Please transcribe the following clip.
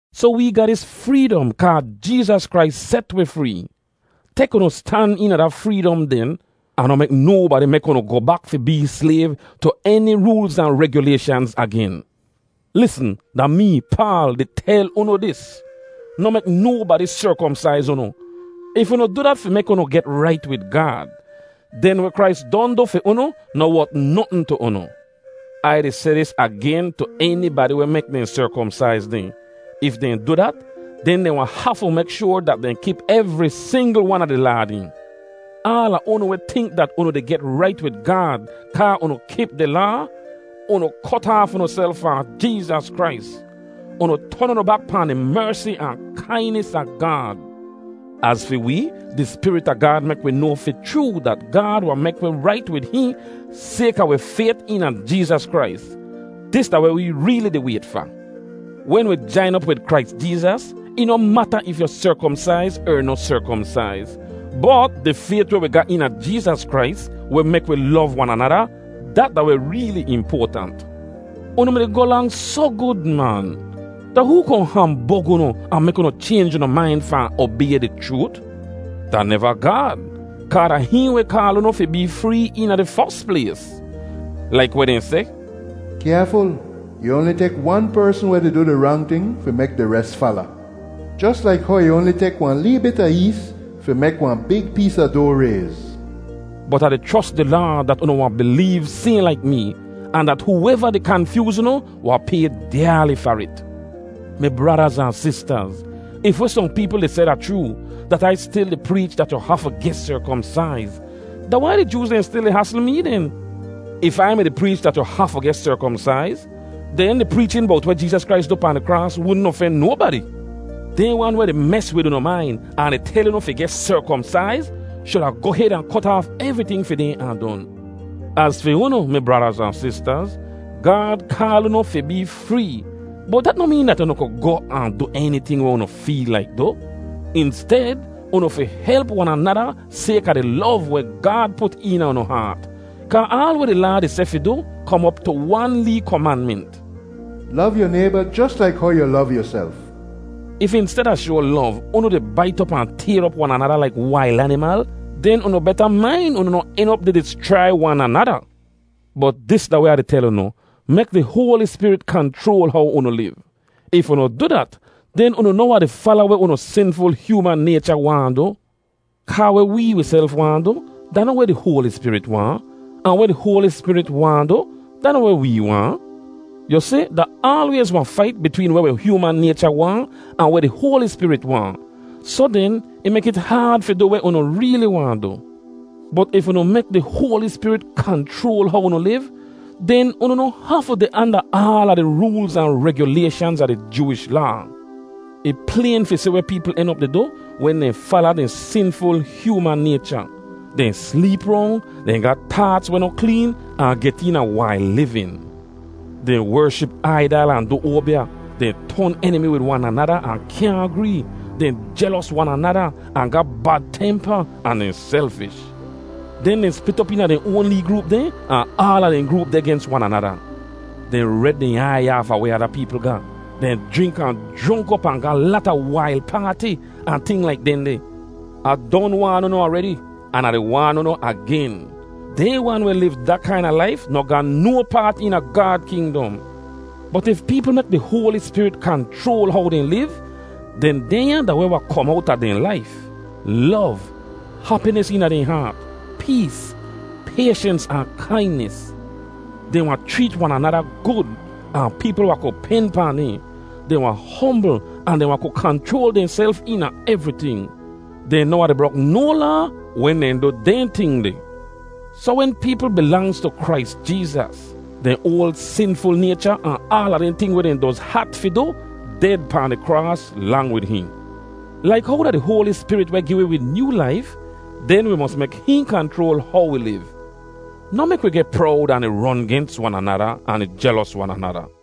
Soh wee ga dis freedom kaa Jeezas Krais set wi free. Tek unu stan eena da freedom den, ahn noh mek nobadi mek unu goh bak fi bee slayv tu eni roolz ahn regyulayshanz agen. Lisn! Da mee, Paal, di tel unu dis: Noh mek nobadi serkomsaiz unu! If unu du dat fi mek unu get rait wid Gaad, den weh Krais don du fi unu noh wot notn tu unu. Ai di seh dis agen tu enibadi weh mek dehn serkomsaiz dehn: if dehn du dat, den dehn wahn hafu mek shoar dat dehn kip evri singl wan a di laa dehn. Aala unu weh tink dat unu di get rait wid Gaad kaa unu kip di Laa, unu kot aaf unuself fahn Jeezas Krais. Unu ton unu bak pahn di mersi ahn kainis a Gaad. Az fi wee, di Spirit a Gaad mek wi noa fi chroo dat Gaad wahn mek wi rait wid hihn sayka wi fayt eena Jeezas Krais. Dis da weh wee reeli di wayt fa. Wen wi jain op wid Krais Jeezas, ih noh mata if yu serkomsaiz er noh serkomsaiz. Bot di fayt weh wi ga eena Jeezas Krais, weh mek wi lov wan anada, dat da weh reeli impoatant. Unu mi-di goh lang soh gud, man. Da hoo kohn hambog unu ahn mek unu chaynj unu main fahn obay di chroot? Da neva Gaad, kaa da hihn weh kaal unu fi bee free eena di fos plays. Laik weh dehn seh, “Kyaaful, ih oanli tek wan persn weh di du di rang ting fi mek di res fala, jos laik how ih oanli tek wahn lee bit a ees fi mek wahn big pees a doa rayz.” Bot Ah di chros di Laad dat unu wahn bileev sayhn laik mee, ahn dat hooeva di kanfyooz unu wahn pay dyaali far it. Mi bradaz ahn sistaz, if weh sohn peepl di seh da chroo, dat Ai stil di preech dat yu hafu geh serkomsaiz, da wai di Jooz dehn stil di hasl mee den? If Ai mi-di preech dat yu hafu geh serkomsaiz, den di preechin bowt weh Jeezas Krais du pahn di kraas wudn ofen nobadi. Dehn wan weh di mes wid unu main ahn di tel unu fi geh serkomsaiz shuda goh hed ahn kot aaf evriting fi dehn ahn don. Az fi unu, mi bradaz ahn sistaz, Gaad kaal unu fi bee free, bot dat noh meen dat unu ku goh ahn du eniting weh unu feel laik du. Insted, unu fi help wan anada sayka di lov weh Gaad put eena unu haat, kaa aal weh di Laa di seh fi du kom op tu wan lee komanment: “Lov yu nayba jos laik how yu lov yuself.” If insteda shoa lov, unu di bait op ahn tayr op wan anada laik wail animal, den unu beta main unu noh en op di dischrai wan anada. Bot dis da weh Ah di tel unu: Mek di Hoali Spirit kanchroal how unu liv. If unu du dat, den unu noh wahn di fala weh unu sinful hyooman naycha waahn du. Kaa weh wee wiself waahn du da noh weh di Hoali Spirit waahn, ahn weh di Hoali Spirit waahn du da noh weh wee waahn. Yu si, da aalwayz wahn fait bitween weh wi hyooman naycha waahn ahn weh di Hoali Spirit waahn, soh den ih mek it haad fi du weh unu reeli waahn du. Bot if unu mek di Hoali Spirit kanchroal how unu liv, den unu noh hafu deh anda aala di roolz ahn regyulayshanz a di Jooish Laa. Ih playn fi si weh peepl en op di du wen dehn fala dehn sinful hyooman naycha: dehn sleep rong, dehn ga taats weh noh kleen, ahn get eena wail livin. Dehn wership aidal ahn du oabya; dehn ton enimi wid wan anada ahn kyaahn gree; dehn jelos wan anada, ahn ga bad tempa, ahn dehn selfish. Den dehn split op eena dehn oan lee groop dehn, ahn aala dehn groop deh gens wan anada. Dehn red dehn aiy aafa weh ada peepl ga; dehn jrink ahn jronk op ahn ga lata wail paati, ahn ting laik dehndeh. Ah don waan unu aredi, an Ah di waan unu agen: dehn wan weh liv da kaina laif noh ga no paat eena Gaad kingdom. Bot if peepl mek di Hoali Spirit kanchroal how dehn liv, den dehnya da weh wahn kom owta dehn laif: lov, hapinis eena dehn haat, pees, payshens ahn kainis. Dehn wahn chreet wan anada gud, ahn peepl wahn ku pen pahn dehn; dehn wahn hombl ahn dehn wahn ku kanchroal dehnself eena evriting. Dehn noh wahn di brok no laa wen dehn du dehn ting deh. Soh wen peepl bilangz tu Krais Jeezas, dehn oal sinful naycha ahn aala dehn ting weh dehn doz hat fi du, ded pahn di kraas lang wid hihn. Laik how da di Hoali Spirit weh gi wi wi nyoo laif, den wi mos mek hihn kanchroal how wi liv. Noh mek wi geh prowd ahn di ron gens wan anada ahn di jelos wan anada.